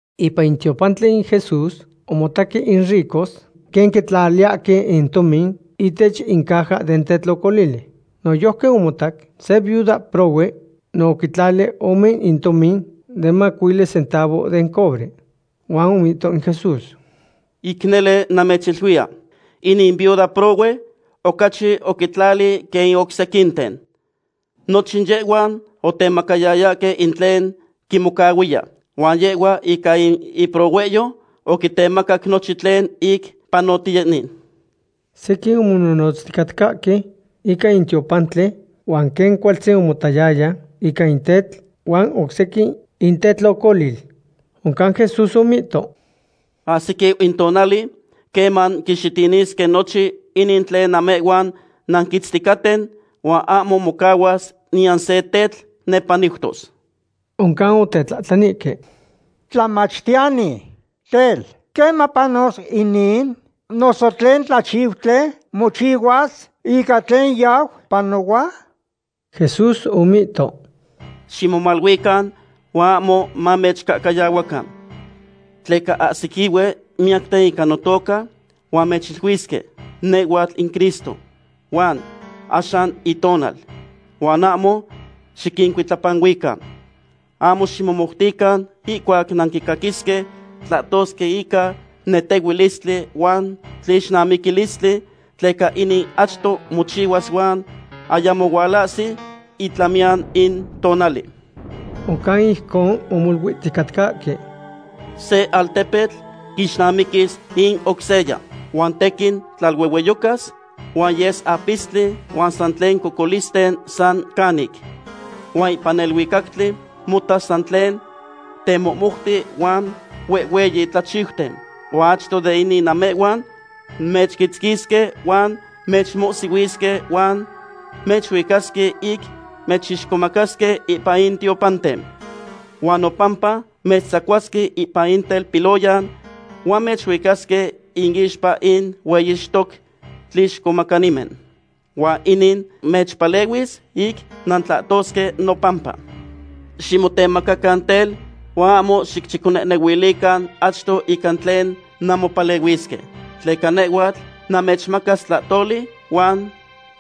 Ipan in tiopantli in Jesús omotaque in ricos quen quitlaliyahque in tomin ihtech in caja den tetlocolili. Noyojqui omotac se viuda prohue no oquitlali ome in tomin de mamacuili centavo den cobre. Huan omihto in Jesús: ―Ic nele namechiluiya, inin viuda prohue ocachi oquitlali quen in oc sequinten. Nochin yehhuan otemacayayahque in tlen quimocahuiya, huan yehhua ica in iprohuehyo oquitemacac nochin tlen ic panotiyeni. Sequin omonohnotzticatcahque ica in tiopantli huan quen cualtzin omotayaya ica in tetl huan oc sequin in tetlocolil. Oncan Jesús omihto: ―Ahsiquiu in tonali queman quixitinisque nochin inin tlen namehhuan nanquitzticaten, huan ahmo mocahuas niyan se tetl nepaniutos. Oncan otetlahtlanihque: ―Tlamachtiyani, tel, ¿queman panos inin? ¿Noso tlen tlachiutli mochihuas ica tlen yau panohua? Jesús omihto: ―Ximomaluican huan ahmo mamechcahcayahuacan. Tleca ahsiquihue miyacten ica notoca, huan mechiluisque: “Nehhuatl in Cristo”; huan “Axan in itonal.” Huan ahmo xiquincuitlapanuican. Ahmo ximomoutican ihcuac nanquicaquisque tlahtosque ica netehuilistli huan tlixnamiquilistli, tleca inin achto mochihuas huan ayamo hualahsi itlamiyan in tonali. Oncan ijcon omoluihticatcahque: ―Se altepetl quixnamiquis in oc seya. Huan tequin tlaluehueyocas, huan yes apistli huan san tlen cocolisten san canic. Huan ipan neluicactli motas san tlen temohmouti huan huehhueyi tlachiuten. ’Huan achto de inin namehhuan mechquitzquisque huan mechmohsihuisque huan mechuicasque ic mechixcomacasque ipan in tiopanten. Huan nopampa mechtzacuasque ipan in telpiloyan huan mechuicasque inixpa in hueyixtoque tlixcomacanimen. Huan inin mechpalehuis ic nantlahtosque nopampa. Ximotemacacan tel, huan ahmo xicchiconehnehuilican achto ica tlen nanmopalehuisque. Tleca nehhuatl namechmacas tlahtoli huan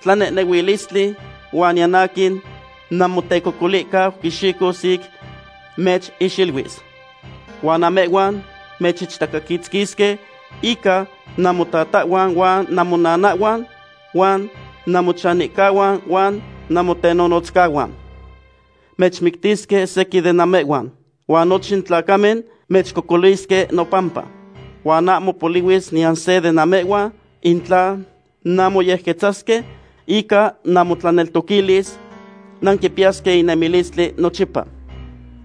tlanehnehuilistli, huan niyan aquin namotecocolihcau quixicos ic mechixiluis. Huan namehhuan mechichtacaquitzquisque ica namotatahhuan huan namocnihuan huan namochanihcahuan huan namotenonotzcahuan. Mechmictisque sequin de namehhuan. Huan nochin tlacamen mechcocolisque nopampa. Huan ahmo polihuis niyan se de namehhuan. In tla nanmoyequetzasque ica namotlaneltoquilis, nanquipiyasque in nemilistli nochipa.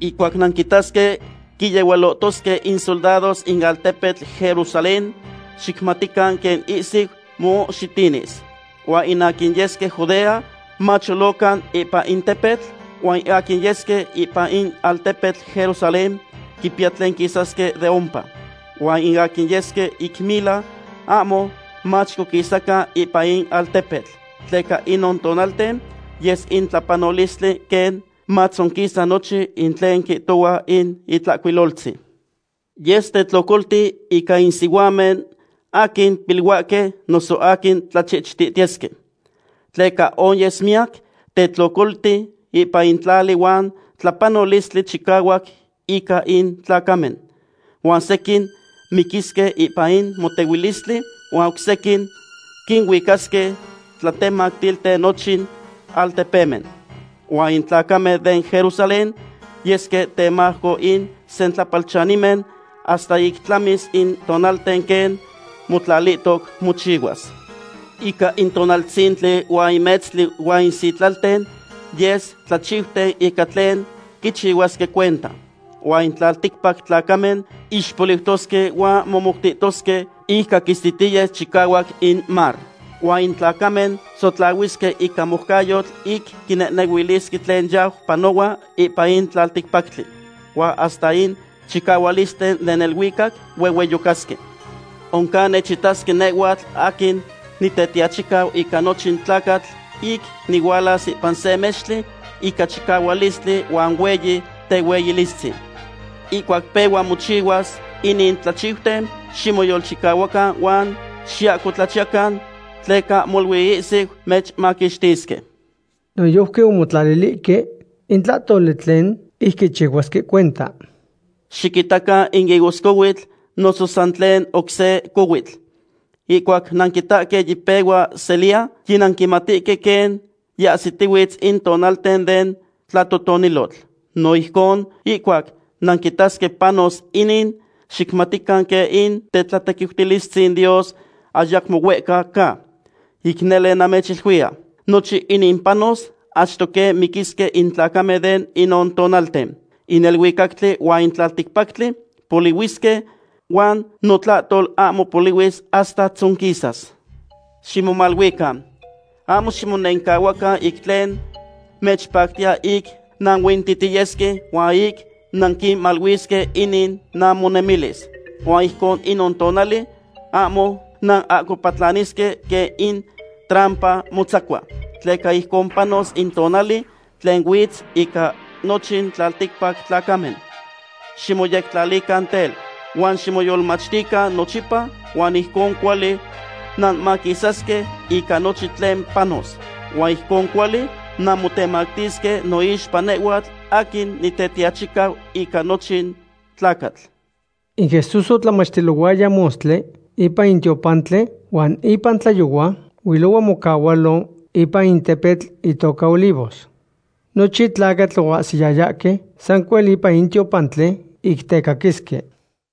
’Ihcuac nanquitasque quiyehualohtosque in soldados in altepetl Jerusalén, xicmatican quen ihsiu moxitinis. Huan in aquin yesque Judea macholocan ipan in tepetl, huan in aquin yesque ipan in altepetl Jerusalén quipiya tlen quisasque de ompa. Huan in aquin yesque ic mila ahmo machicoquisacan ipan in altepetl. Tleca inon tonalten yes in tlapanolistli quen matzonquisa nochin in tlen quihtohua in Itlahcuiloltzin. Yes tetlocolti ica in sihuamen aquin piluahque noso aquin tlachichihtihtiyesque. Tleca onyes miyac tetlocolti ipan in tlali huan tlapanolistli chicahuac ica in tlacamen. Huan sequin miquisque ipan in motehuilistli huan oc sequin quinuicasque tlatemactilten nochin altepemen. Huan in tlacamen den Jerusalén yesque temajco in sentlapalchanimen hasta ic tlamis in tonalten quen motlalihtoc mochihuas. ’Ica in tonaltzintli huan in metztli huan in sitlalten yes tlachiuten ica tlen quichihuasque cuenta. Huan in tlalticpac tlacamen ixpoliutosque huan momoutihtosque ic caquistitiyes chicahuac in mar. Huan in tlacamen sotlahuisque ica moucayotl ic quinehnehuilisque tlen yau panohua ipan in tlalticpactli. Huan hasta in chicahualisten den neluicac huehueyocasque. Oncan nechitasque nehhuatl aquin Nitetiachicau ica nochin tlacatl ic nihualas ipan se mextli ica chicahualistli huan hueyi tehueyilistzin. Ihcuac pehua mochihuas inin tlachiuten, ximoyolchicahuacan huan xiahcotlachiyacan, tleca molui ihsiu mechmaquixtisque. Noyojqui omotlalilihque in tlahtoli tlen ic quichihuasque cuenta: ―Xiquitacan in higoscohuitl noso san tlen oc se cohuitl. Ihcuac nanquitahque yipehua seliya, yinanquimatihque quen yiahsitihuitz in tonalten den tlatotonilotl. No ijcon, ihcuac nanquitasque panos inin, xicmatican quen in tetlatequiutilistzin Dios ayacmo huehca ca. ’Ic nele namechiluiya, nochin inin panos achto quen miquisque in tlacamen de inon tonalten. In neluicactli huan in tlalticpactli polihuisque, huan notlahtol ahmo polihuis hasta tzonquisas. ’Ximomaluican, ahmo ximonencahuacan ic tlen mechpactiya ic nanuintihtiyesque huan ic nanquimaluisque inin namonemilis. Huan ijcon inon tonali ahmo nanahcopatlanisque quen in trampa motzacua, tleca ijcon panos in tonali tlen huitz ica nochin tlalticpac tlacamen. Ximoyectlalican tel, huan ximoyolmachtican nochipa huan ijcon cuali nanmaquisasque ica nochin tlen panos. Huan ijcon cuali nanmotemactisque noixpa nehhuatl aquin Nitetiachicau ica nochin tlacatl. In Jesús otlamachtilohuaya mostli ipan in tiopantli huan ipan tlayohua huilohua mocahualo ipan in tepetl itoca Olivos. Nochin tlacatl oahsiyayahque sancuel ipan in tiopantli ic tecaquisque.